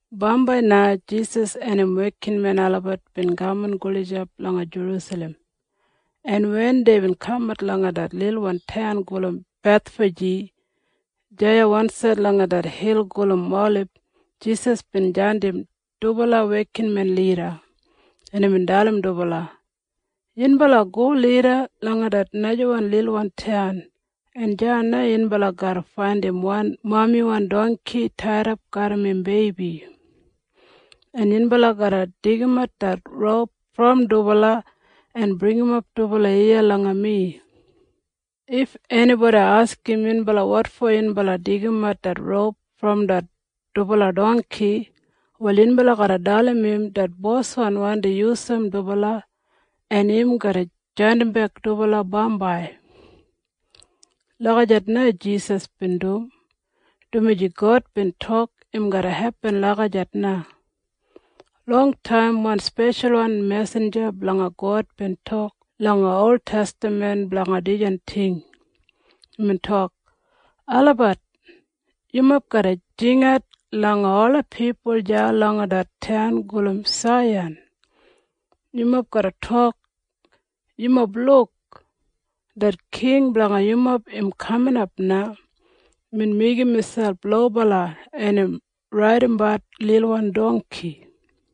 Bambai na Jisas en im wekinmen olabat bin kaman gulijap langa Jerusalem, en wen deibin kamat langa det lilwan taun gulum Bethfaji deya wansaid langa det hil gulum Olib, Jisas bin jandim dubala wekinmen lida, en imbin dalim dubala, “Yunbala go lida langa det najawan lilwan taun, en deya na yunbala garra faindim wan mamiwan dongki taidap garram im beibi, en yunbala garra deigimat det roup brom dubala en bringimap dubala iya langa mi. If enibodi askim yunbala wotfo yunbala deigimat det roup brom det dubala dongki, wal yunbala garra dalim im det boswan wandi yusum dubala, en im garra jandimbek dubala bambai.” Lagijat na Jisas bin dum, dumaji God bin tok im garra hepin lagijat na. Longtaim wan speshalwan mesinja blanga God bin tok langa oltestaman blanga dijan ting. Imbin tok, “Olabat! Yumob garra jingat langa ola pipul deya langa det taun gulum Saiyan. Yumob garra tok, ‘Yumob luk! Det king blanga yumob im kaminap na. Imbin meigim miselp lobala, en im raidimbat lilwan dongki.’”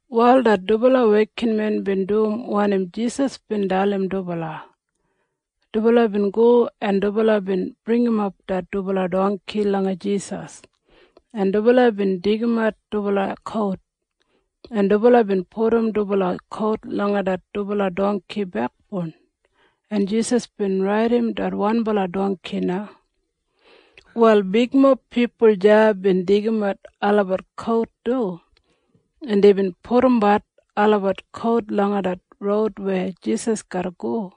Wal det dubala wekinmen bin dum wanim Jisas bin dalim dubala. Dubala bin go, en dubala bin bringimap det dubala dongki langa Jisas, en dubala bin deigimat dubala kout, en dubala bin pudum dubala kout langa det dubala dongki bekboun, en Jisas bin raidim det wanbala dongki na. Wal bigmob pipul deya bin deigimat olabat kout du, en deibin pudumbat olabat kout langa det roud weya Jisas garra go,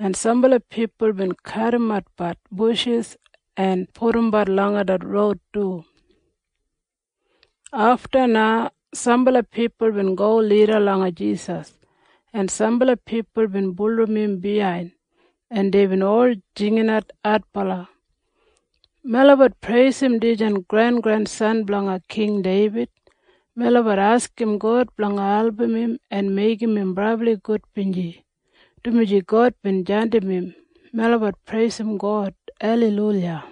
en sambala pipul bin kadimbat bushis en pudumbat langa det roud du. Afta na sambala pipul bin go lida langa Jisas, en sambala pipul bin bulurrum im biyain, en deibin ol jinginat adbala, “Melabat preisim dijan grengrensan blanga King Deibid! Melabat askim God blanga album im en meigim im brabli gudbinji, dumaji God bin jandim im. Melabat preisim God! Aleiluya!”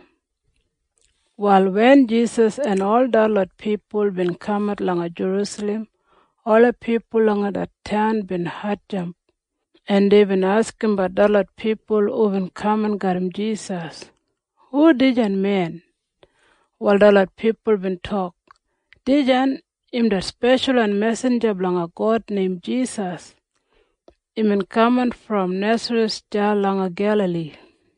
Wal wen Jisas en ol detlot pipul bin kamat langa Jerusalem, ola pipul langa det taun bin hatjamp, en deibin askimbat detlot pipul hubin kaman garram Jisas, “Hu dijan men?” Wal detlot pipul bin tok, “Dijan im det speshalwan mesinja blanga God neim Jisas. Imbin kaman brom Nesareth deya langa Gelali.”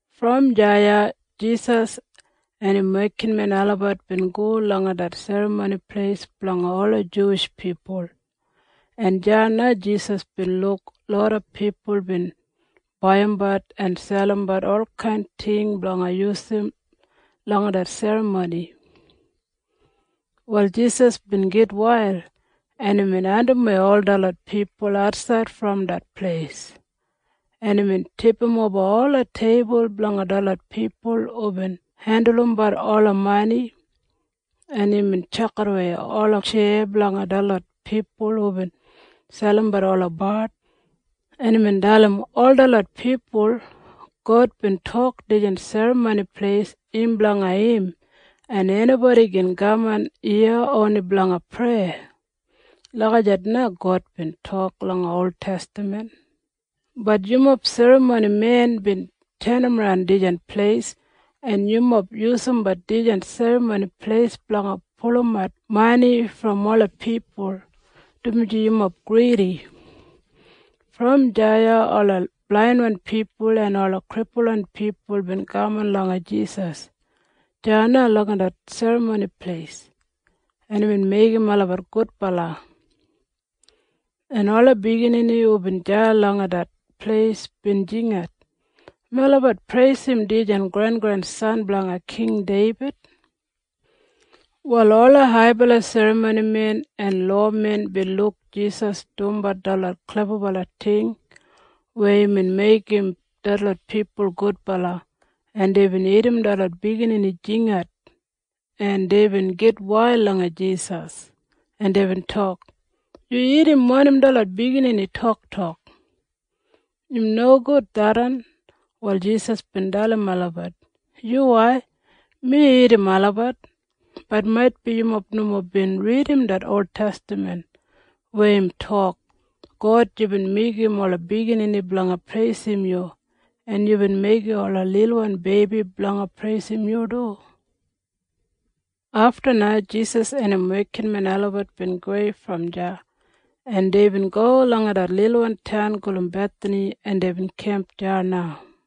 Brom deya Jisas en im wekinmen olabat bin go langa det Serramoni Pleis blanga ola Juwish pipul, en deya na Jisas bin luk loda pipul bin baiyimbat en selimbat olkain ting blanga yusum langa det serramoni. Wal Jisas bin gitwail, en imbin andimwei ol detlot pipul atsaid brom det pleis, en imbin tipimoba ola teibul blanga detlot pipul hubin hendulumbat ola mani, en imbin tjakidawei ola tjeya blanga detlot pipul hubin selimbat ola bard, en imbin dalim ol detlot pipul, “God bin tok dijan Serramoni Pleis im blanga im, en enibodi gin kaman iya oni blanga preya. Lagijat na God bin tok langa oltestaman. Bat yumob serramonimen bin tenimran dijan pleis, en yumob yusumbat dijan Serramoni Pleis blanga pulumat mani brom ola pipul, dumaji yumob gridi.” Brom deya ola blainwan pipul en ola kripulwan pipul bin kaman langa Jisas deya langa det Serramoni Pleis, en imbin meigim olabat gudbala, en ola biginini hubin deya langa det pleis bin jingat, “Melabat preisim dijan grengrensan blanga King Deibid!” Wal ola haibala serramonimen en lowamen bin luk Jisas dumbat detlot klebabala ting weya imbin meigim detlot pipul gudbala, en deibin irrim detlot biginini jinginat, en deibin gitwail langa Jisas, en deibin tok, “Yu irrim wanim detlot biginini toktok? Im nogud tharran.” Wal Jisas bin dalim olabat, “Yuwai, mi irrim olabat. Bat maitbi yumob nomo bin ridim det oltestaman weya im tok, ‘God, yubin meigim ola biginini blanga preisim yu, en yubin meigim ola lilwan beibi blanga preisim yu du.’” Afta na Jisas en im wekinmen olabat bin gowei brom deya, en deibin go langa det lilwan taun gulum Bethani, en deibin kemp deya na.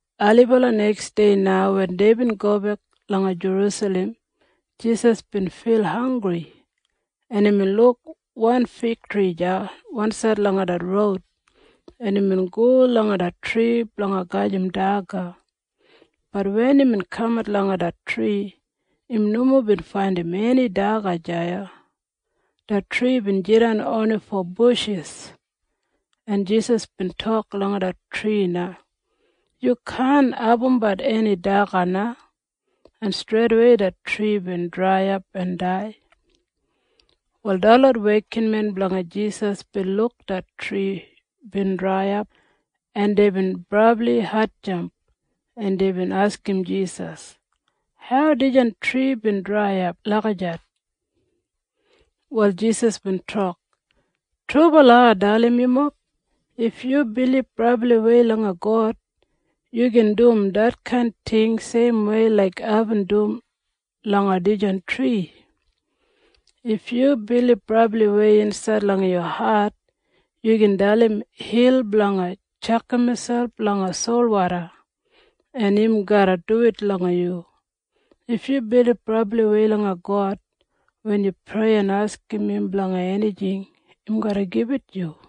Ailibala neksdei na wen deibin gobek langa Jerusalem, Jisas bin fil hanggri, en imbin luk wan figtri deya wansaid langa det roud, en imbin go langa det tri blanga gajim daga. Bat wen imbin kamat langa det tri, im nomo bin faindim eni daga deya. Det tri bin jidan oni fo bushis, en Jisas bin tok langa det tri na, “Yu kaan abumbat eni daga na.” En streidawei det tri bin draiyap en dai. Wal detlot wekinmen blanga Jisas bin luk det tri bin draiyap en deibin brabli hatjamp en deibin askim Jisas, “Hau dijan tri bin draiyap lagijat?” Wal Jisas bin tok, “Trubala ai dalim yumob. If yu bilib brabliwei langa God, yu gin dum detkain ting seimwei laik aibin dum langa dijan tri. If yu bilib brabliwei insaid langa yu hat, yu gin dalim hil blanga tjakam miselp langa solwoda, en im garra duwit langa yu. If yu bilib brabliwei langa God, wen yu prei en askim im blanga enijing, im garra gibit yu.”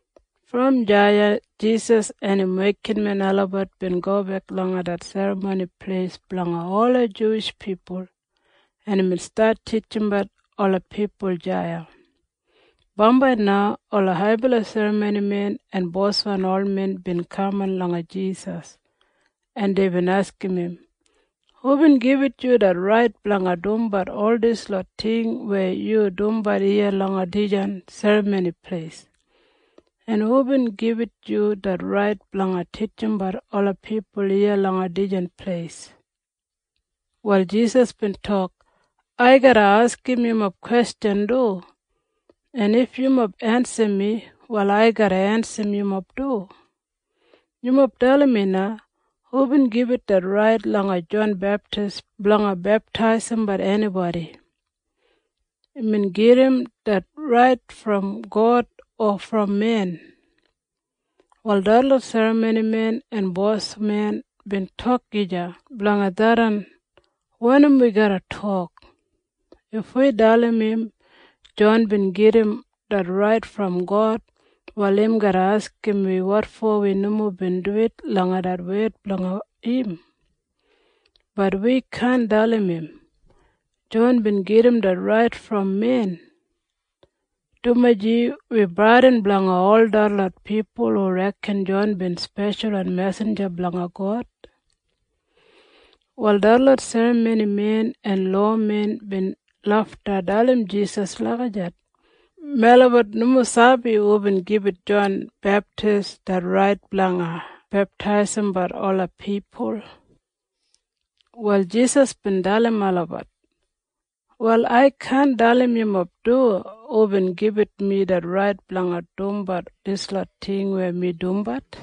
Brom deya Jisas en im wekinmen olabat bin gobek langa det Serramoni Pleis blanga ola Juwish pipul, en imbin stat titjimbat ola pipul deya. Bambai na ola haibala serramonimen en boswan olmen bin kaman langa Jisas, en deibin askim im, “Hubin gibit yu det rait blanga dumbat ol dislot ting weya yu dumbat iya langa dijan Serramoni Pleis? En hubin gibit yu det rait blanga titjimbat olabat pipul iya langa dijan pleis?” Wal Jisas bin tok, “Ai garra askim yumob kwestjan du, en if yumob ensim mi, wal ai garra ensim yumob du. Yumob dalim mi na. Hubin gibit det rait langa Jon Beptis blanga beptaisimbat enibodi? Imbin gedim det rait brom God o brom men?” Wal detlot serramonimen en bosmen bin tok gija blanga tharran, “Wanim wi garra tok? If wi dalim im Jon bin gedim det rait brom God, wal im garra askim wi wotfo wi nomo bin duwit langa det wed blanga im. Bat wi kaan dalim im, ‘Jon bin gedim det rait brom men,’ dumaji wi bradin blanga ol detlot pipul hu reken Jon bin speshalwan mesinja blanga God.” Wal detlot serramonimen en lowamen bin lafta dalim Jisas lagijat, “Melabat nomo sabi hubin gibit Jon Beptis det rait blanga beptaisimbat ola pipul.” Wal Jisas bin dalim olabat, “Wal ai kaan dalim yumob du hubin gibit mi det rait blanga dumbat dislot ting weya mi dumbat.”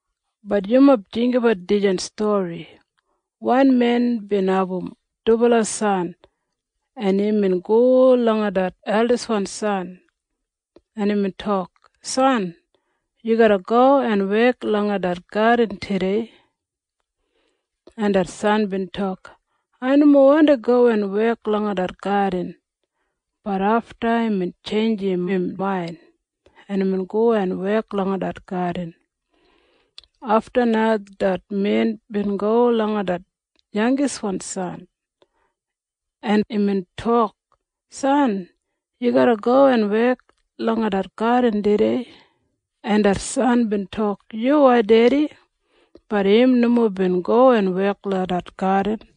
“Bat yumob jinggabat dijan stori. Wan men bin abum dubala san, en imbin go langa det eldiswan san, en imbin tok, ‘San, yu garra go en wek langa det gadin tudei.’ En det san bin tok, ‘Ai nomo wandi go en wek langa det gadin.’ Bat afta imbin tjeinjim im main, en imbin go en wek langa det gadin. Afta na det men bin go langa det yangiswan san, en imbin tok, ‘San, yu garra go en wek langa det gadin tudei.’ En det san bin tok, ‘Yuwai, Dedi.’ Bat im nomo bin go en wek langa det gadin.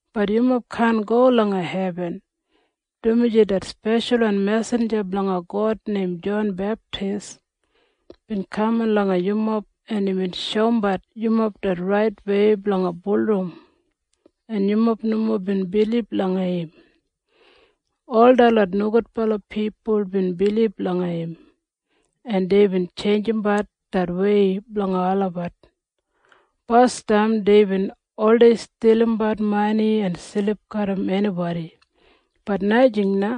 Bat yumob kaan go langa hebin, dumaji det speshalwan mesinja blanga God neim Jon Beptis bin kaman langa yumob, en imbin shoumbat yumob det raitwei blanga bulurrum, en yumob nomo bin bilib langa im. Ol detlot nogudbala pipul bin bilib langa im, en deibin tjeinjimbat det wei blanga olabat. Basdam deibin oldei stilimbat mani en silip garram enibodi. Bat najing na.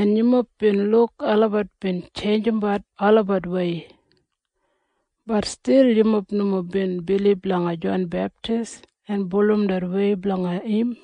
En yumob bin luk olabat bin tjeinjimbat olabatwei. Bat stil yumob nomo bin bilib langa Jon Beptis en bulurrum det wei blanga im.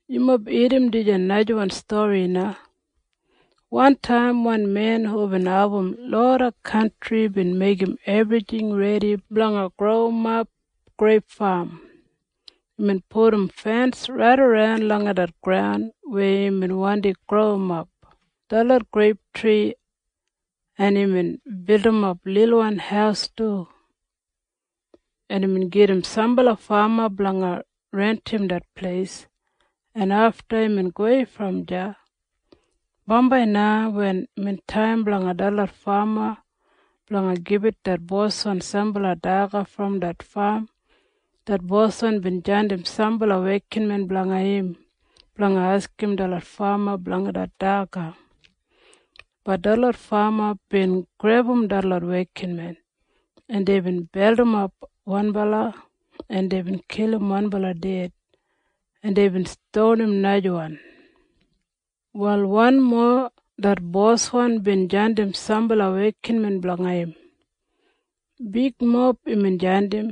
“Yumob irrim dijan najawan stori na. Wantaim wan men hubin abum loda kantri bin meigim ebrijing redi blanga growimap greip fam. Imbin pudum fens raidaran langa det graun weya imbin wandi growimap detlot greiptri, en imbin bildimap lilwan haus du, en imbin gedim sambala fama blanga rentim det pleis, en afta imbin gowei brom deya. Bambai na wen imbin taim blanga detlot fama blanga gibit det boswan sambala daga brom det fam, det boswan bin jandim sambala wekinmen blanga im blanga askim detlot fama blanga det daga. Bat detlot fama bin grebum detlot wekinmen, en deibin beldimap wanbala, en deibin kilim wanbala ded, en deibin stonim najawan. Wal wanmo det boswan bin jandim sambala wekinmen blanga im. Bigmob imbin jandim.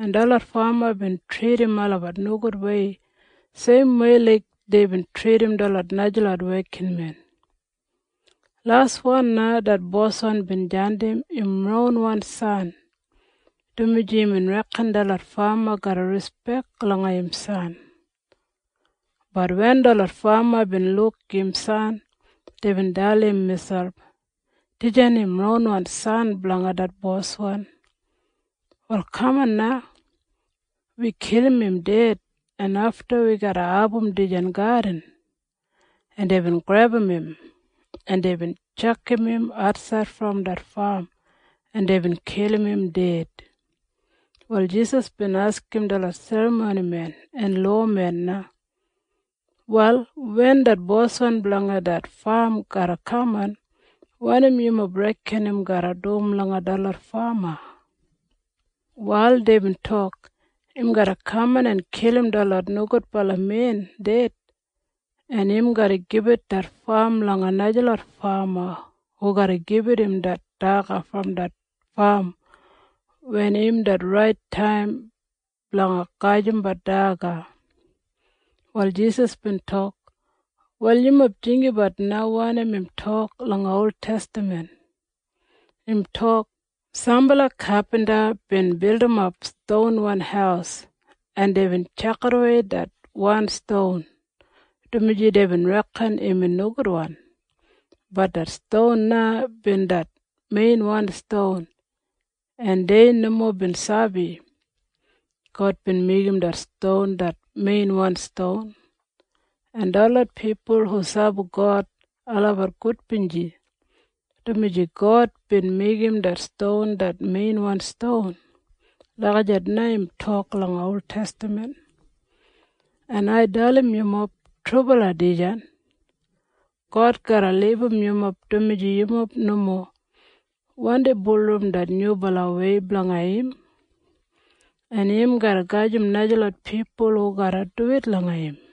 En detlot fama bin tridim olabat nogudwei seimwei laik deibin tridim detlot najalot wekinmen. Laswan na det boswan bin jandim im ronwan san, dumaji imbin reken detlot fama garra rispek langa im san. Bat wen detlot fama bin luk im san, deibin dalim miselp, ‘Dijan im ronwan san blanga det boswan. Wal kaman na. Wi kilim im ded, en afta wi garra abum dijan gadin.’ En deibin grebum im, en deibin tjakam im atsaid brom det fam, en deibin kilim im ded.” Wal Jisas bin askim detlot serramonimen en lowamen na, “Wal wen det boswan blanga det fam garra kaman, wanim yumob reken im garra dum langa detlot fama?” Wal deibin tok, “Im garra kaman en kilim detlot nogudbala men ded, en im garra gibit det fam langa najalot fama hu garra gibit im det daga brom det fam wen im det rait taim blanga gajimbat daga.” Wal Jisas bin tok, “Wal yumob jinggabat na wanim im tok langa oltestaman. Im tok, ‘Sambala kapinta bin bildimap stonwan haus, en deibin tjakidawei det wan ston, dumaji deibin reken imbin nogudwan. Bat det ston na bin det meinwan ston, en dei nomo bin sabi. God bin meigim det ston det meinwan ston, en detlot pipul hu sabi God olabat gudbinji, dumaji God bin meigim det ston det meinwan ston.’ Lagijat na im tok langa oltestaman. En ai dalim yumob trubala dijan. God garra libum yumob, dumaji yumob nomo wandi bulurrum det Nyubalawei blanga im, en im garra gajim najalot pipul hu garra duwit langa im.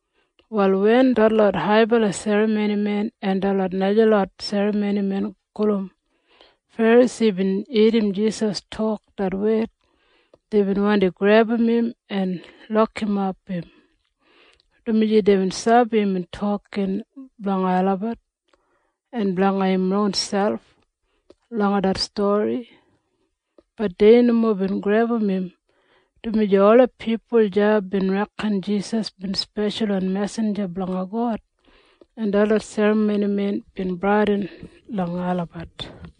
Wal wen detlot haibala serramonimen en detlot najalot serramonimen gulum Ferasi bin irrim Jisas tok det wed, deibin wandi grebum im en lokimap im, dumaji deibin sabi imbin tokin blanga olabat en blanga im ronselp langa det stori. Bat dei nomo bin grebum im, dumaji ola pipul deya bin reken Jisas bin speshalwan mesinja blanga God, en detlot serramonimen bin bradin langa olabat.